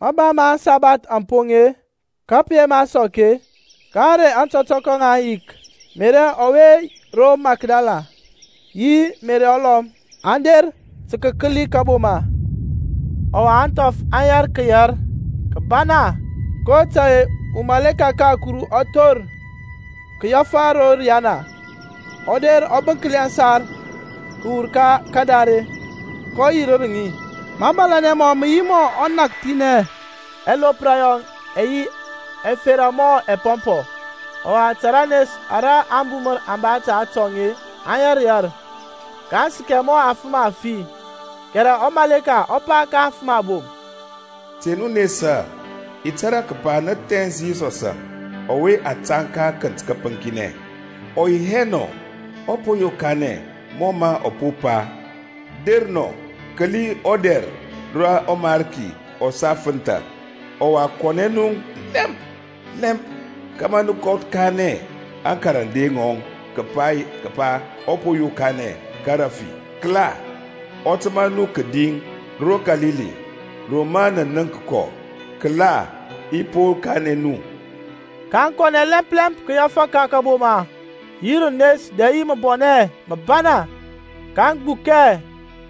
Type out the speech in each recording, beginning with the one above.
Mba ma aŋsabath aŋ poŋ-e, ka pǝ yema sɔk-e, ka ȧŋrey ȧtɔtɔkɔ ŋa ȧŋyik, Meri ɔwe ro Makdala yi Meriȧŋ ulɔm, aŋ der tǝ kǝkǝli kȧboma. Ɔwa ȧŋthɔf aŋ yɛr kǝyɛr kǝbana kotȧy-e umaleka ka Kuru ɔ thor kǝyɛfǝ ro riyana, ɔ der ɔ bǝnkli aŋsar kǝwur ka kadare, kɔ yirǝr ŋi. Mȧbȧlȧnɛ mɔŋ mǝ yi mɔ ɔnakthinɛ, ɛlopra yɔŋ ɛ yi ɛfera mɔ ɛpɔmpɔ. Ɔwa ta ranes ara ȧŋbumǝr aŋ ba ta atɔŋ-e aŋ yɛr yɛr, kaŋ sǝkɛ mɔ afǝm afi. Kɛrɛ ɔmaleka ɔ pa ka aŋfǝm abom, Te nu nesa, i tȧrȧ kǝpa nǝ thɛns Yisɔsȧŋ ɔwe a tȧŋ ka akǝnt kǝpǝŋkinɛ. Ɔ yi hɛ nɔ; ɔ po yokanɛ mɔ mǝ ɔ po pa. Der nɔ, kǝli ɔdɛr rǝ ɔMarki ɔ sa fǝntha. Ɔwa kɔnɛ nu lɛmp lɛmp kȧmȧ nǝ kanɛ aŋkarande ŋɔŋ kǝpa ɔ po yokanɛ ka rafi. Kǝla, ɔ tǝma nu kǝdi ro Kalili, ro mǝ nǝ nənk kɔ. Kǝla i po kanɛ nu. kaŋ kɔnɛ lɛmp lɛmp kǝyɛfǝ ka kȧboma yi rǝnes dɛ yi mǝbɔnɛ mǝbana, kaŋ gbukɛ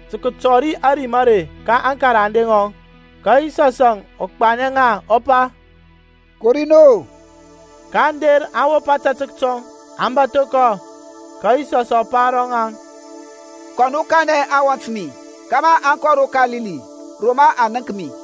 tǝ kǝtɔri ȧrim are ka aŋkarande ŋɔŋ. Ka Yisɔs ɔ gbanɛ ŋa, ɔ pa, Kori nu-o. Kaŋ der aŋ wop ȧtȧtək tɔŋ, aŋ bȧtho kɔ. Ka Yisɔsȧŋ ɔ pa ro ŋaŋ, Te nu nesa; kɔ nu kanɛ aŋwɔnt mi kȧmȧ aŋ kɔ ro Kalili ro mǝ aŋ nənk mi.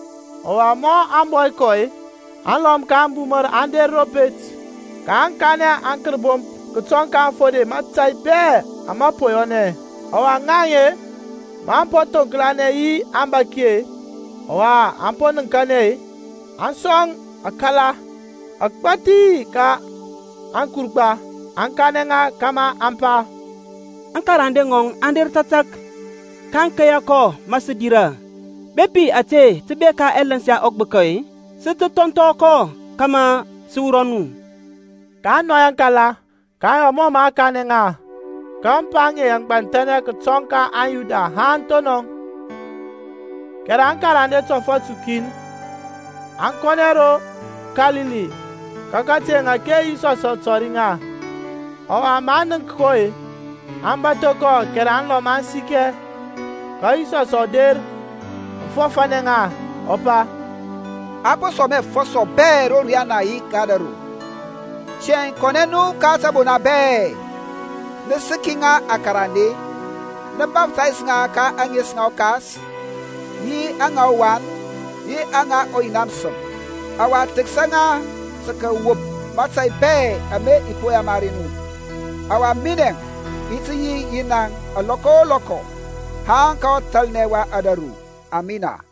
Ɔwa mɔ aŋ bɔ kɔ-e, alɔm ka ȧŋbumǝr aŋ der ro pet, kaŋ kanɛ aŋkərbomp kǝtɔŋ ka aŋfode mȧtȧy bɛ ama po yɔnɛ. Ɔwa ŋaŋ-e, maŋ po thoŋklanɛ yi aŋbȧki-e, ɔwa aŋ po nǝŋkanɛ-e, aŋ sɔŋ akala agbȧthi ka aŋkurgba, aŋ kanɛ ŋa kȧmȧ aŋ pa, Aŋkarande ŋɔŋ aŋ der tȧtȧk, kaŋ keya kɔ ma sǝ dirȧ. Bepi ȧte tǝ bek ka ɛlǝns ya ɔgbǝka-e, sǝ tǝ thɔnthɔ kɔ kȧmȧ sǝ wurɔ nu. kaŋ nɔy aŋkala, kaŋ yɔ mɔ mǝ a kanɛ ŋa. Ka ȧŋpa aŋe aŋ gbanthɛnɛ kǝtɔŋ ka aŋYuda haŋ thonɔŋ. Kɛrɛ aŋkarande tɔfɔt ukin aŋ kɔnɛ ro Kalili ka kateŋ ȧke Yisɔsȧŋ ɔ tɔri ŋa. Ɔwa maŋ nənk kɔ-e, aŋ bȧtho kɔ kɛrɛ aŋlɔm aŋ sikɛ. Ka Yisɔsȧŋ ɔ der ɔ fɔfȧnɛ ŋa, ɔ pa, A po sɔŋ mi afɔsɔ bɛ ro riyana yi ka ȧdȧru. Tiyȧŋ kɔnɛ nu ka tǝbona bɛ-e, nǝ sǝki ŋa akarande, nǝ baftays ŋa ka ȧŋes ŋa ɔKas, yi aŋa ɔWan, yi aŋa ɔYina mǝsǝm; ɔwa thǝksa ŋa tǝ kǝwop mȧtȧy bɛ ama i po yamari nu. Ɔwa minɛȧŋ i yi yi naŋȧŋ alɔkɔ o lɔkɔ, haŋ ka ɔthalnɛ wa ȧdȧru. Amina.